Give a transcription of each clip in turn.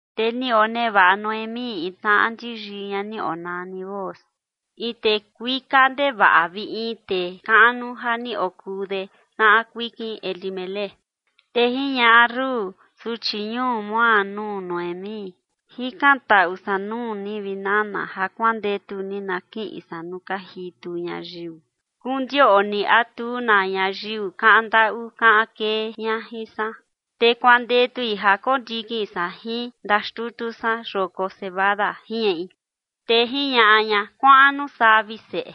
Te ni onevaꞌa Noemí in tnaꞌa ndi yii ña ni onani Booz, in tee kuika ndevaꞌa vi in tee kaꞌnu ja ni okuu de tnaꞌa kuikin Elimelec. Te jiñaꞌa Rut, suchi ñuu Moab, nuu Noemí: ―Jikantaꞌu san nuu ni, vi nana, ja kuandetu ni na kiꞌin san nuu ka jitu ñayiu, kondioꞌni a tu na ñayiu kaꞌan ndaꞌu kaꞌan kee ña jin san, te kuandetui ja kondikin san jin ndaxtutu san yoko cebada ―jiñaꞌi. Te jiñaꞌa ña: ―Kuaꞌan nuu saa, vi seꞌe.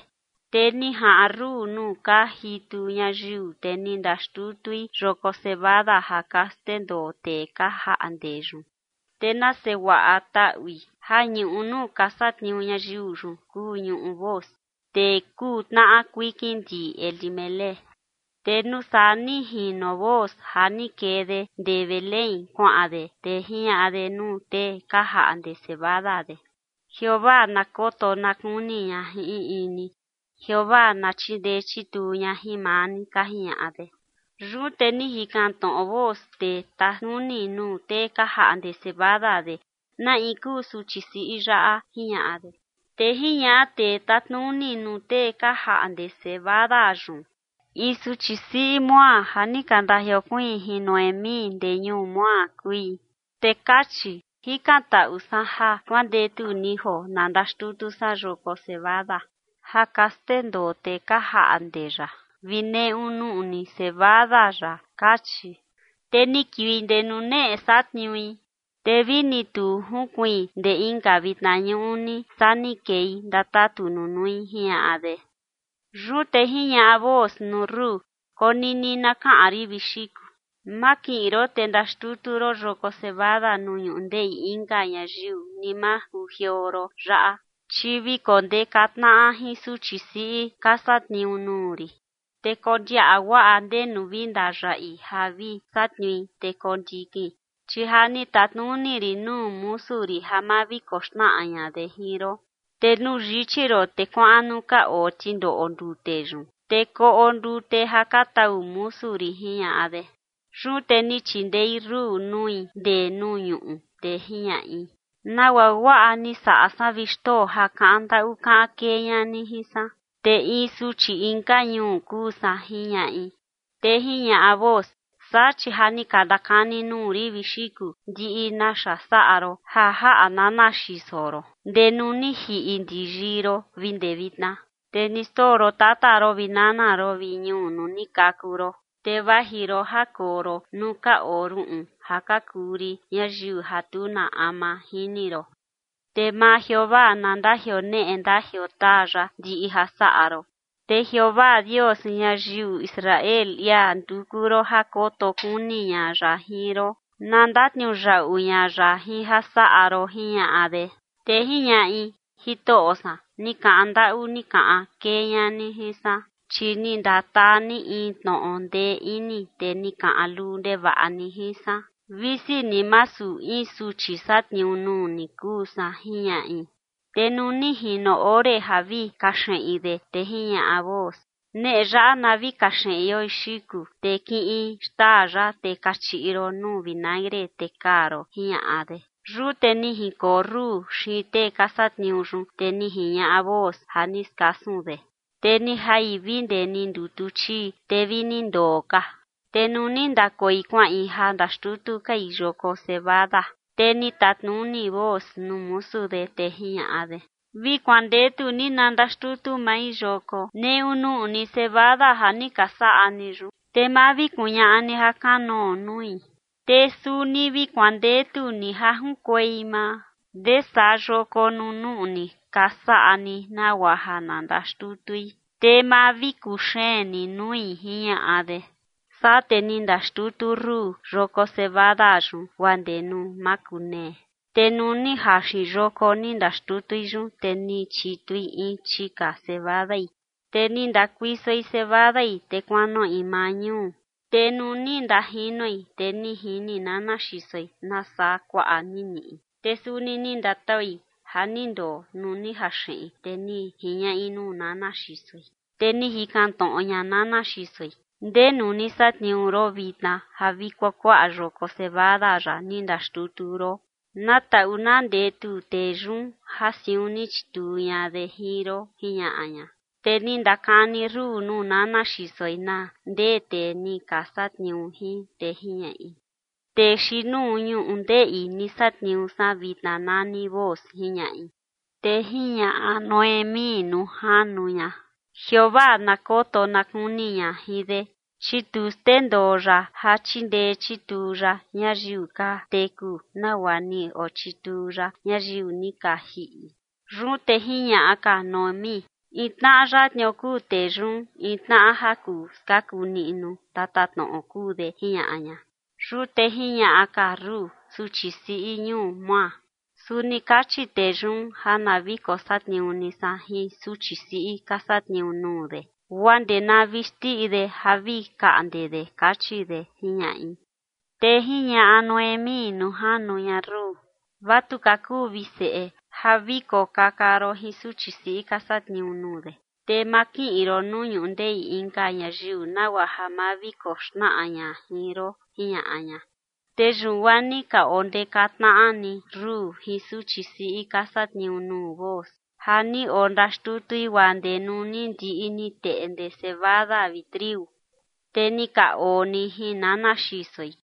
Te ni jaꞌan Rut nuu ka jitu ñayiu, te ni ndaxtutui yoko cebada ja ka xndendoo tee ka jaꞌnde yun. Te nase guaꞌa taꞌui ja ñuꞌu nuu ka satniuu ñayiu yun kuu ñuꞌu Booz, tee kuu tnaꞌa kuikin ndi Elimelec. Te nuu saa ni jino Booz ja ni kee de ndee Belén kuaꞌan de, te jiñaꞌa de nuu tee ka jaꞌnde cebada de: ―Jeovaa na koto na kuni ña jin in in ni. ―Jeovaa na chindee chituu ña jin maa ni ―ka jiñaꞌa de. Yun te ni jikan tnoꞌo Booz tee tatnuni nuu tee ka jaꞌnde cebada de: ―¿Na in kuu suchi siꞌi yaꞌa? ―jiñaꞌa de. Te jiñaꞌa tee tatnuni nuu tee ka jaꞌnde cebada yun: ―In suchi siꞌi Moab ja ni ka ndajiokuiin jin Noemí ndee ñuu Moab kui. Te kachi: “Jikantaꞌu san ja kuandetu ni joo na ndaxtutu san yoko cebada ja ka xndendoo tee ka jaꞌnde yaꞌa vi neꞌu nuꞌni cebada yaꞌa”, kachi. Te ni kiui ndee nuneꞌe satniui, te vi ni tu jinkuiin ndee inka vitna ñuꞌni, saa ni kei ndatatu nunui ―jiñaꞌa de. Yun te jiñaꞌa Booz nuu Rut: ―Konini na kaꞌan rin, vi xiku. Ma kiꞌin ron te ndaxtutu ron yoko cebada nuu ñundeꞌi inka ñayiu, ni ma kujioo ron yaꞌa, chi vi kondeka tnaꞌa jin suchi siꞌi ka satniuu nuu rin. Te kondiaꞌa guaꞌa ndenu vi ndayaꞌi ja vi satniui, te kondikin. Chi ja ni tatnuni rin nuu musu rin ja ma vi koxnaꞌa ña de jin ron. Te nuu yichi ron te kuaꞌan nuu ka oo tindoꞌo ndute yun, te koꞌo ndute ja ka tau musu rin ―jiñaꞌa de. Yun te ni chindei Rut nui ndee nuu ñuꞌu, te jiñaꞌi: ―¿Nagua guaꞌa ni saꞌa san, vi xtoo, ja kaꞌan ndaꞌu kaꞌan kee ña ni jin san? Te in suchi inka ñuu kuu san ―jiñaꞌi. Te jiñaꞌa Booz: ―Saa, chi ja ni ka ndakani nuu rin, vi xiku, ndiꞌi naxa saꞌa ron ja jaꞌa nana xiso ron ndee nuu ni jiꞌi ndi yii ron vi ndee vitna. Te ni xndoo ron tata ron vi nana ron vi ñuu nuu ni kaku ron, te vaji ron ja koo ron nuu ka oo ruꞌun ja ka kuu rin ñayiu ja tu na ama jini ron. Te maa Jeovaa na ndajioneꞌe ndajiotaa ya ndiꞌi ja saꞌa ron. Te Jeovaa Dios ñayiu Israel, ia nduku ron ja koto kuni ña ya jin ron, na ndatniuyaꞌu ña ya jin ja saꞌa ron ―jiñaꞌa de. Te jiñaꞌi: ―Jitoꞌo san, ni kaꞌan ndaꞌu ni kaꞌan kee ña ni jin san, chi ni ndataa ni in tnoꞌo ndee ini, te ni kaꞌan luu ndevaꞌa ni jin san, visi ni masu in suchi satniuu nuu ni kuu san ―jiñaꞌi. Te nuu ni jino ore ja vi kaxeꞌin de, te jiñaꞌa Booz: ―Neꞌe yaꞌa na vi kaxeꞌion, xiku, te kiꞌin xtaa yaꞌa te kachiꞌi ron nuu vinagre te kaa ron ―jiñaꞌa de. Yun te ni jinkoo Rut xiin tee ka satniuu yun, te ni jiñaꞌa Booz ja ni skasun de. Te ni jai vi ndee ni ndutu chii, te vi ni ndoo ka. Te nuu ni ndakoi kuaꞌin ja ndaxtutu kai yoko cebada, te ni tatnuni Booz nuu musu de, te jiñaꞌa de: ―Vi kuandetu ni na ndaxtutu mai yoko neꞌu nuꞌni cebada ja ni ka saꞌa ni yun, te ma vi kuñaꞌa ni jakanoo nui. Te suni vi kuandetu ni ja junkuei maa ndesaa yoko nuu nuꞌni ka saꞌa ni nagua ja na ndaxtutui, te ma vi kuxeen ni nui ―jiñaꞌa de. Saa te ni ndaxtutu Rut yoko cebada yun guaa ndee nuu makunee. Te nuu ni jaxin yoko ni ndaxtutui yun, te ni chitui in chika cebadai. Te ni ndakuisoi cebadai, te kuanoꞌi maa ñuu, te nuu ni ndajinoi, te ni jini nana xisoi nasaa kuaꞌa ni niꞌi. Te suni ni ndataui ja ni ndoo nuu ni jaxeꞌin, te ni jiñaꞌi nuu nana xisoi. Te ni jikan tnoꞌo ña nana xisoi: ―¿Ndenu ni satniuu ron vitna ja vi kuakuaꞌa yoko cebada yaꞌa ni ndaxtutu ron? Na taꞌu na ndetu tee yun ja siun ni chituu ña de jin ron ―jiñaꞌa ña. Te ni ndakani Rut nuu nana xisoi na ndee tee ni ka satniuu jin, te jiñaꞌi: ―Tee xiin nuu ñundeꞌi ni satniuu san vitna nani Booz ―jiñaꞌi. Te jiñaꞌa Noemí nuu janu ña: ―Jeovaa na koto na kuni ña jin de, chi tu xndendoo ya ja chindee chituu ya ñayiu ka teku nagua ni ochituu ya ñayiu ni ka jiꞌi. Yun te jiñaꞌa ka Noemí: ―In tnaꞌa yatnio kuu tee yun, in tnaꞌa ja kuu skaku niꞌnu tatatnoꞌo kuu de ―jiñaꞌa ña. Yun te jiñaꞌa ka Rut, suchi siꞌi ñuu Moab: ―Suni kachi tee yun ja na vi kosatniuu ni san jin suchi siꞌi ka satniuu nuu de guaa ndee na vi xndiꞌi de ja vi kaꞌnde de, kachi de ―jiñaꞌi. Te jiñaꞌa Noemí nuu janu ña Rut: ―Vatuka kuu, vi seꞌe, ja vi kokaka ron jin suchi siꞌi ka satniuu nuu de, te ma kiꞌin ron nuu ñundeꞌi inka ñayiu nagua ja ma vi koxnaꞌa ña jin ron ―jiñaꞌa ña. Te yun guaa ni ka ondeka tnaꞌa ni Rut jin suchi siꞌi ka satniuu nuu Booz, ja ni ondaxtutui guaa ndee nuu ni ndiꞌi ni teꞌnde cebada vi triu. Te ni ka oo ni jin nana xisoi.